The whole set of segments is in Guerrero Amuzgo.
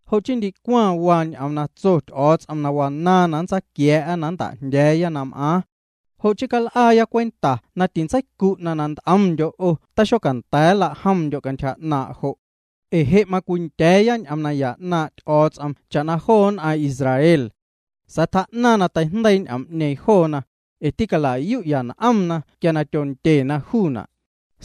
Jo' chii ndicwaⁿ waa ñ'oom na tso Ty'o̱o̱ts'om na wanaaⁿ na nntsaaquia̱a̱'a na nnta'jndya̱a̱ya na m'aaⁿ. Jo' chii cal'aaya cwenta na tintseicu'na' na nt'omndyo' 'o taxocanda̱a̱ nlajomndyo' cantyja 'naaⁿ' jo'. Ee je' macwindya̱a̱ya ñ'oom naya 'naaⁿ' Ty'o̱o̱ts'om cha'na joo nn'aⁿ Israel. Sa̱a̱ tjaa'naⁿ na teijndeii ñ'oom'ñeeⁿ joona, ee tîcala'yu'ya n'omna quia tyondyena juuna'.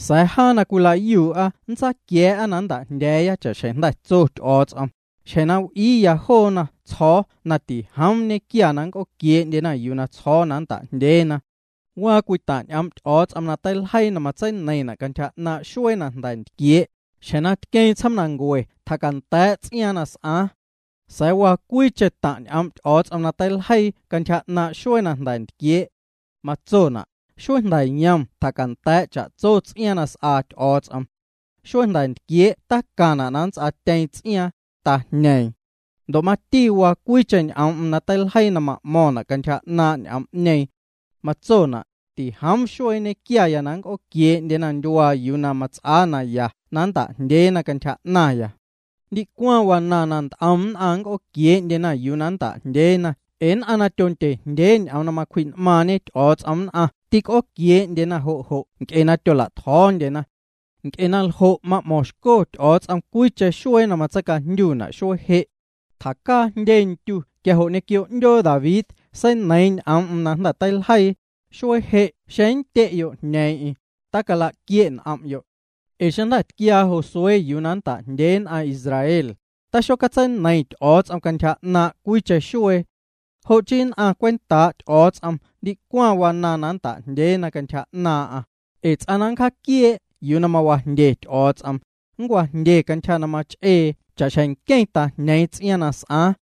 Sa̱a̱ jaa na cwila'yuu'a nntsaquia̱a̱'a yuu na nnta'jndya̱a̱ya cha'xjeⁿ jnda̱ tso Ty'o̱o̱ts'om: Xjeⁿ na w'iiya joona tsjo̱o̱ na tijoom ñequia na nnc'ooquiee'ndyena yuu na tsjo̱o̱ na nnta'jndyeena. Waa cwii taⁿ' ñ'oom' Ty'o̱o̱ts'om na teiljeii na matseineiⁿna' cantyja 'naaⁿ' xuee na jnda̱ ntquiee': Xjeⁿ na tqueeⁿ tsjoomnancue tjacanda̱a̱' ts'iaaⁿ na s'aaⁿ. Sa̱a̱ waa cwiicheⁿ taⁿ' ñ'oom' Ty'o̱o̱ts'om na teiljeii cantyja 'naaⁿ' xuee na jnda̱ ntquiee'. Matsona': Xuee jnda̱ yom tjacanda̱a̱' cha'tso ts'iaaⁿ na s'aa Ty'o̱o̱ts'om. Xuee jnda̱ ntquiee' tacaⁿna' na nnts'aatyeeⁿ ts'iaaⁿ, tajñeeⁿ. Ndo' mati waa cwiicheⁿ ñ'oom'm na teiljeii na ma'mo̱ⁿna' cantyja 'naaⁿ' juu ñ'oom'ñeeⁿ. Matsona': Tijoom xuee nñequia na nnc'ooquie'na ndyuaa yuu na mats'aa naya na nnta'jndyeena cantyja 'naⁿya. Ndicwaⁿ wanaaⁿ na nt'om nn'aⁿ nnc'ooquiee'ndyena yuu na nnta'jndyeena ee nn'aⁿ na tyondye jndyee ñ'oom na macwji'n'maaⁿñe Ty'o̱o̱ts'om nn'aⁿ tîc'ooquiee'ndyena jo' jo' nc'e na tyola'tjo̱o̱ndyena. Nc'e naljo' ma'mo̱ⁿxco Ty'o̱o̱ts'om cwiicheⁿ xuee na matseicajndyuna' xuee je'. Tjacaa jndye ndyu quia jo' ñequio 'ndyoo David seineiiⁿ ñ'oom'm na jnda̱ teiljeii: Xuee je' xeⁿ nndye'yo' jñeeⁿ'eⁿ, tilaquie' n'om'yo'. Ee xeⁿ jnda̱a̱ tquiaa Josué yuu na nnta'jndyee nn'aⁿ Israel, tixocatseineiⁿ Ty'o̱o̱ts'om cantyja 'naaⁿ' cwiicheⁿ xuee. Jo' chii nn'aⁿ cwentaa' Ty'o̱o̱ts'om ndicwaⁿ waa na nnta'jndyeena cantyja 'naaⁿ'aⁿ, ee ts'aⁿ na nncjaquiee' yuu na mawajndye Ty'o̱o̱ts'om, nncwajndye cantyja na mach'ee cha'xjeⁿ nqueⁿ tajñeeⁿ ts'iaaⁿ na s'aaⁿ.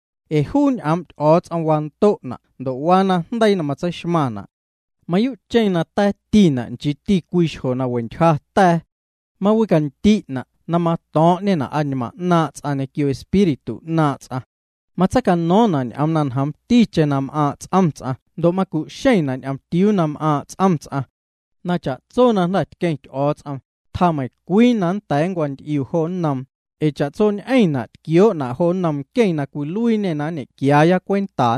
Ee juu ñ'oom' Ty'o̱o̱ts'om wando'na' ndo' waa najndeii na matseixmaⁿna'. Ta̱a̱ticheⁿ juuna' nchiiti cwii xjo na we ntyja ta̱a̱. Mawindi' juuna' na mato̱o̱ⁿ'ñena' añmaaⁿ' ts'aⁿ ñequio espíritu 'naaⁿ' ts'aⁿ. Matseicano̱o̱ⁿna' ñ'oom na ñjoomticheⁿ na m'aaⁿ' ts'om ts'aⁿ ndo' macu'xeⁿna' ñomtiuu na m'aaⁿ' ts'om ts'aⁿ. Na cha'tso na jnda̱ tqueⁿ Ty'o̱o̱ts'om, tjaa meiⁿcwii na nnda̱a̱ nncwanty'iu jo nnoom, ee cha'tsoñ'eⁿ m'aⁿ xueena' jo nnom nqueⁿ na nñequiandyo̱ cwenta.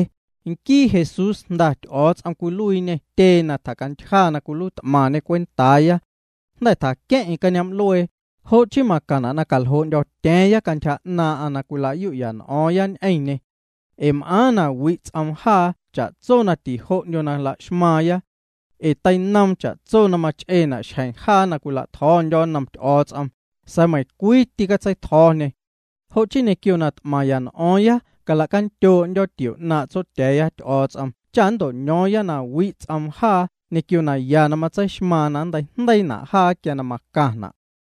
Nquii Jesús Jnda Ty'o̱o̱ts'om cwiluiiñê tyee na tjacantyja cwentaaya. Jnda̱ tjaqueⁿ'eⁿ cañoom'luee, jo' chii macaⁿna' na caljoo'ndyo̱tya̱a̱ⁿya cantyja 'naaⁿ' na cwila'yu'ya n'o̱o̱ⁿya ñ'eⁿñê. Ee m'aaⁿ na wi' ts'oom jaa cha'tso na tijo'ndyo na la'xmaaⁿya. Ee teinoom cha'tso na mach'eena' xjeⁿ jaa na cwila'tjo̱o̱ndyo̱ nnom Ty'o̱o̱ts'om, sa̱a̱ meiⁿcwii tîcatseitjo̱o̱ñê. Jo' chii ñequio na t'maⁿya n'o̱o̱ⁿya calacandyoo'ndyo̱ tio 'naaⁿ' Tsotya̱a̱ya Ty'o̱o̱ts'om cha nnto'ño̱o̱ⁿya na wi' ts'oom jaa ñequio naya na matseixmaaⁿ na nnteijndeiina' jaa quia na macaⁿna'.